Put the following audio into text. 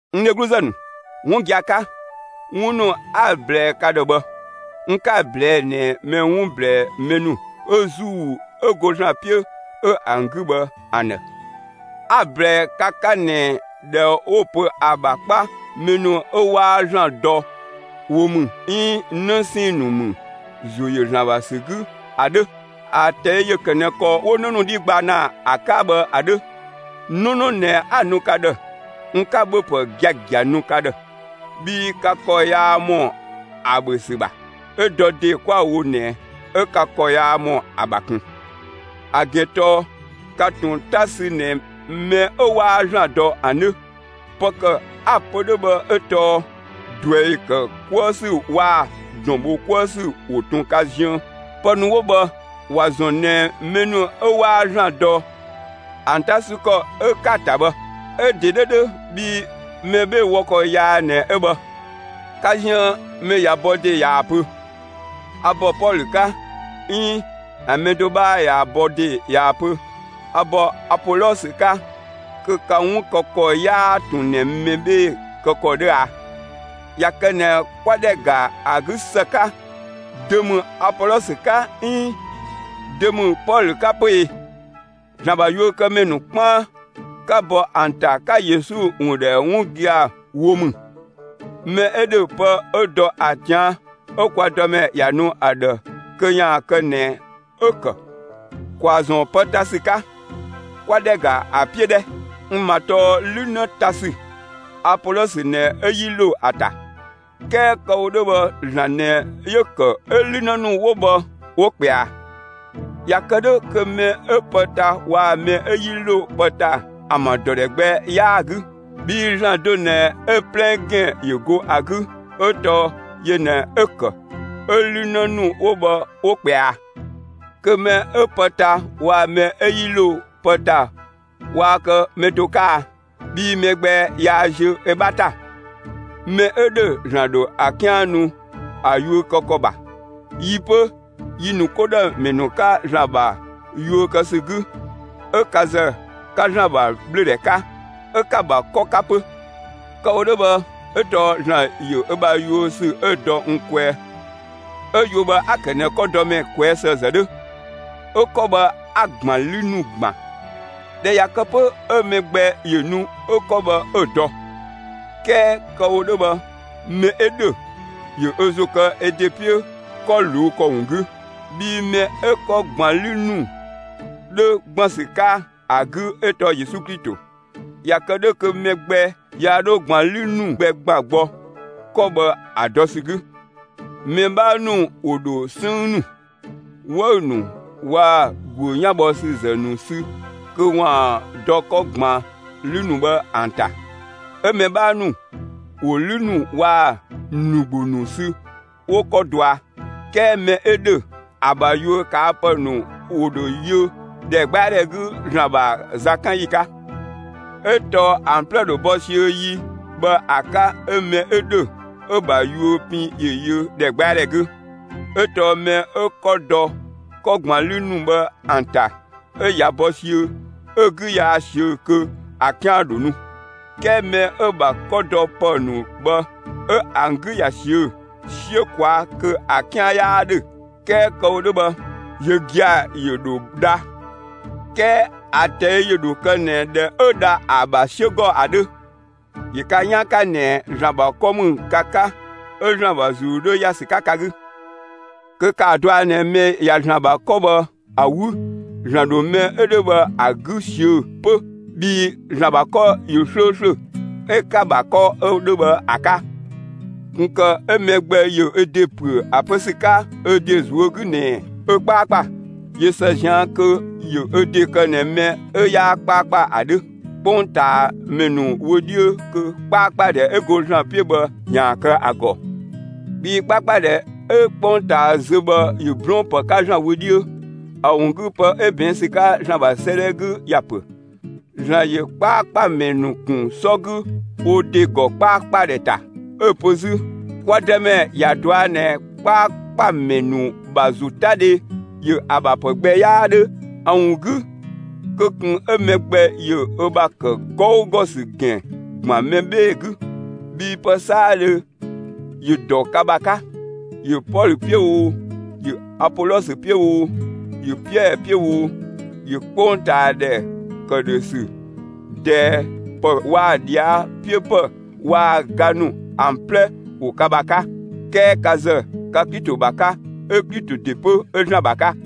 N dhegluzë ‑nu, 'wun gia‑ 'ka, 'wun ‑nu 'a‑ ꞊blɛɛ ka ‑dhë bhë, n 'ka‑ ꞊blɛɛ' ꞊nɛ mɛ 'wun ꞊blɛɛ mɛ ‑nu 'ö ‑Zuu 'ö go ‑Zlan 'piö 'ö ‑an 'gü bhë ‑an ‑dhë; 'a‑ ‑blɛɛ ka 'ka ꞊nɛ ‑dhɛ 'wo‑ pö ‑a ‑bha 'kpa mɛ ‑nu 'ö 'waa ‑Zlan dɔ wo ‑mü 'iin 'në 'sɛɛn‑ ‑nu ‑mü ‑zo ‑yö ‑Zlan ‑bha ‑sü 'gü ‑a 'dhö. ‑A ꞊tɛi' ‑yö ‑kë ꞊nɛ ‑kɔ 'wo 'në ‑nu 'dhi gba ‑na ‑a 'ka bhë ‑a 'dhö. 'Nɔnɔ ꞊nɛ 'a‑ nu ka ‑dhë; n 'ka ‑bhöpë giagia nu ka ‑dhë, bhii ka ‑kɔ yaa ‑mɔ ‑a ‑bhö ‑sü ‑bha; 'ö dɔ ‑de 'kwa‑ wo ꞊nɛ 'ö ka ‑kɔ yaa ‑mɔ ‑a ‑bha ꞊kun. ‑A ‑gɛn tɔɔ ka ꞊tun 'ta sü ꞊nɛ mɛ 'ö 'waa ‑Zlan dɔ ‑an 'dhö. Pë ‑kë 'a‑ pö 'dhö bhë 'ö tɔɔ ꞊druɛi ‑kë 'kuë‑ ‑sü waa‑ ‑dɔn ‑bho 'kuë ‑sü ‑wo ꞊tun ka ziën. Pë ‑nu 'wo bhë, ‑wa ‑zɔn ꞊nɛ mɛ ‑nu 'ö 'waa ‑Zlan dɔ ‑an 'ta 'sü ‑kɔ 'ö 'ka‑ ‑ta bhë; 'ö‑ ‑de 'dhö 'dhö bhii mɛ 'bhee‑ wɔ ‑kɔ yaa ꞊nɛ 'ö bhë. Ka ziën mɛ ꞊ya bɔ ‑de ꞊yaa‑ pö: «A ‑bɔ Pɔlö 'ka», 'iin ‑a mɛ do 'bhaa ꞊ya bɔ ‑de ꞊yaa‑ pö: «A ‑bɔ Apolɔsö 'ka» kö ka 'wun kë ‑kɔ 'yaa ꞊tun ꞊nɛ mɛ 'bhee‑ kë ‑kɔ 'dhö a? ꞊Ya kë ꞊nɛ 'kwa ‑dhɛ ‑ga ‑a 'gü ‑së 'ka, dö ‑mü Apolɔsö 'ka 'iin dö ‑mü Pɔlö 'ka 'pö e? ‑Zlan ‑bha yuökëmɛ ‑nu 'kpaan, 'ka bɔ ‑an ‑ta 'ka Yesu ‑wun ‑dhɛ 'wun gia‑ wo ‑mü. Mɛ 'ö ‑dhö pë 'ö dɔ ‑a ꞊tian' 'ö kwa Dëmɛ ‑ya nu ‑a ‑dhë kö ‑yaan kë ꞊nɛ 'ö‑ ‑kë. ‑Kwaa ‑zɔn pë ta ‑sü 'ka, 'kwa ‑dhɛ ‑ga ‑a 'piö 'dhɛ! N ‑ma tɔɔ 'lü 'në ta ‑sü. Apolɔsö ꞊nɛ 'ö 'yi ‑lo ‑a ‑ta; 'kɛɛ kë‑ wo 'dhö bhë ‑Zlan ꞊nɛ 'yö‑ ‑kë 'ö 'lü 'në ‑nu 'wo bhë, 'wo ꞊kpɛa. ꞊Ya kë 'dhö kö mɛ 'ö pë ta waa‑ mɛ 'ö 'yi ‑lo pë ‑ta ‑an ‑bha ‑dɔ ‑dhɛ gbɛ 'yaa‑ 'gü. Bhii ‑Zlan do ꞊nɛ 'ö‑ 'plɛ ‑gɛn ‑yö go ‑a 'gü, 'ö tɔɔ yö ꞊nɛ 'ö‑ ‑kë 'ö 'lü 'në ‑nu 'wo bhë 'wo ꞊kpɛa. Kö mɛ 'ö pë ta waa‑ mɛ 'ö 'yi ‑lo pë ‑ta waa kë mɛ do 'ka e? Bhii mɛ gbɛ yaa ziö ö 'bha ‑ta. Mɛ 'ö ‑dhö ‑Zlan ‑dho ‑a 'kian nu ‑a yuö kë ‑kɔ ‑bha. Yi 'pö, yi ‑nu 'ko ‑dhë ‑mɛ ‑nu 'ka ‑Zlan ‑bha yuö kë ‑sü 'gü, 'ö ka ‑zë, 'ka ‑Zlan ‑bha ꞊bhlöödhɛ 'ka; 'ö 'ka‑ ‑bha 'kɔ 'ka 'pö. Kë‑ wo 'dhö bhë 'ö tɔɔ ‑Zlan ‑yö ö ‑bha yuö ‑sü 'ö‑ dɔ n kwɛɛ 'ö yuö bhë 'a‑ ‑kë ꞊nɛ 'kɔdɔmɛ ꞊kwɛɛ' ‑së ‑zë 'dhö, 'ö 'kɔ bhë 'a‑ ꞊gban 'lü ‑nu ‑gban. ꞊Dhɛ ꞊ya kë 'pö, 'ö mɛ gbɛ ‑yö nu 'ö 'kɔ bhë 'ö‑ dɔ. 'Kɛɛ kë‑ wo 'dhö bhë mɛ 'ö ‑dhö, ‑yö ö ‑zo ‑kë ö ‑de 'piö 'kɔ ꞊luu' ‑kɔ ‑wun 'gü. Bhii mɛ 'ö 'kɔ ‑gban 'lü ‑nu 'dhö ‑gban ‑sü 'ka ‑a 'gü 'ö tɔɔ Yesu Klito. ꞊Ya kë 'dhö kö mɛ gbɛ yaa 'dho ꞊gban 'lü ‑nu gbɛ ‑gban gbɔ 'kɔ bhë ‑a dɔ ‑sü 'gü. Mɛ 'bhaa ‑nu ‑wo ‑dho 'sënng ‑nu, 'wëü‑ ‑nu waa‑ ‑guö 'yanbhɔsüzë ‑nu sü kö ‑waan dɔ 'kɔ ‑gban 'lü ‑nu bhë ‑an ‑ta, 'ö mɛ 'bhaa ‑nu ‑wo 'lü ‑nu waa‑ ‑mlü ‑gbo ‑nu sü 'wo 'kɔ dɔa. 'Kɛɛ mɛ 'ö ‑dhö, ‑a ‑bha yuö ꞊kaa' ‑pë ‑nu ‑wo ‑dho yö ‑dhɛgbɛadhɛ 'gü ‑Zlan ‑bha zakanyi 'ka; 'ö tɔɔ ‑an 'plɛ ‑dho bɔ siöö yi bhë ‑a 'ka 'ö mɛ 'ö ‑dhö 'ö‑ ‑bha yuö pin ‑yö yö ‑dhɛgbɛadhɛ 'gü. 'Ö tɔɔ mɛ 'ö 'kɔ dɔ 'kɔ ‑gban 'lü ‑nu bhë ‑an ‑ta, 'ö ꞊ya bɔ siöö, 'ö‑ 'gü yaa ꞊siö', kö ‑a 'kian ‑dho nu. 'Kɛɛ mɛ 'ö‑ ‑bha 'kɔ dɔ pë ‑nu bhë 'ö ‑an 'gü ꞊ya ꞊siö'‑ 'siö ꞊kwaa' kö ‑a 'kian 'yaa 'dhö; 'kɛɛ kë‑ wo 'dhö bhë, yö gia‑ ‑yö ‑dho dha; 'kɛɛ ‑a ꞊tɛi' ‑yö ‑dho kë ꞊nɛ ꞊dhɛ 'ö dha ‑a ‑bha 'siö ‑gɔ ‑a 'dhö. ‑Yö ka 'yaan 'ka ꞊nɛ ‑Zlan ‑bha 'kɔ ‑mü ka 'ka; 'ö ‑Zlan ‑bha ‑Zuu 'dhö ‑ya ‑sü 'ka ka 'gü. Kö ‑kaa dɔa ꞊nɛ mɛ ꞊ya ‑Zlan ‑bha 'kɔ bhë ‑a 'wü, ‑Zlan ‑dho mɛ 'ö 'dhö bhë ‑a 'gü ꞊siö' 'pö bhii ‑Zlan ‑bha 'kɔ ‑yö 'slööslö, 'ö 'ka‑ ‑bha 'kɔ 'ö 'dhö bhë ‑a 'ka. ꞊Kun ‑kë 'ö mɛ gbɛ ‑yö ö ‑de ‑püö ‑a pö ‑sü 'ka ö ‑de ꞊zuö' 'gü ꞊nɛ ö 'kpaakpa. ꞊Yö ‑së ꞊zian' kö ‑yö ö ‑de kë ꞊nɛ mɛ 'ö 'yaa 'kpaakpa ‑a 'dhö 'kpongtaamɛ ‑nu wö 'dhiö kö 'kpaakpadhɛ 'ö go ‑Zlan 'piö bhë ‑yaan kë ‑a ‑gɔ. Bhii 'kpaakpadhɛ 'ö 'kpongtaa zö bhë ‑yö 'blɔɔn‑ ‑pë 'ka ‑Zlan wö 'dhiö. ‑A ‑wun 'gü pë 'ö ꞊bɛɛn' ‑sü 'ka ‑Zlan ‑bha 'sëëdhɛ 'gü ‑ya ‑pö: ‑Zlan ‑yö 'kpaakpamɛ ‑nu ‑kun 'sɔ 'gü wo ‑de ‑gɔ 'kplaakpladhɛ ‑ta. 'Ö‑ pö 'zü: Kwa Dëmɛ ‑ya ꞊dɔa' ꞊nɛ 'kpaakpamɛ ‑nu ‑bha ‑zotadhe ‑yö ‑a ‑bha ‑pë gbɛ 'yaa 'dhö. ‑A ‑wun 'gü, kö ꞊kun 'ö mɛ gbɛ ‑yö ö ‑bha ‑kë 'gɔugɔ ‑sü ‑gɛn ‑gban mɛ 'bhee‑ 'gü; bhii pë 'saadhö ‑yö ‑dɔ ka ‑bha 'ka. ‑Yö Pɔlö 'piö oo, ‑yö Apolɔsö 'piö oo, ‑yö Piɛɛ 'piö oo, ‑yö 'kpongtaadhɛ, ‑këdhösü, ꞊dɛɛ ‑pë waa‑ ꞊dhia' 'piö ‑pë, waa‑ ga ‑nu ‑an 'plɛ ‑wo ka ‑bha 'ka. 'Kɛɛ ka ‑zë, ka Klito ‑bha 'ka, 'ö Klito ‑de 'pö 'ö ‑Zlan ‑bha 'ka.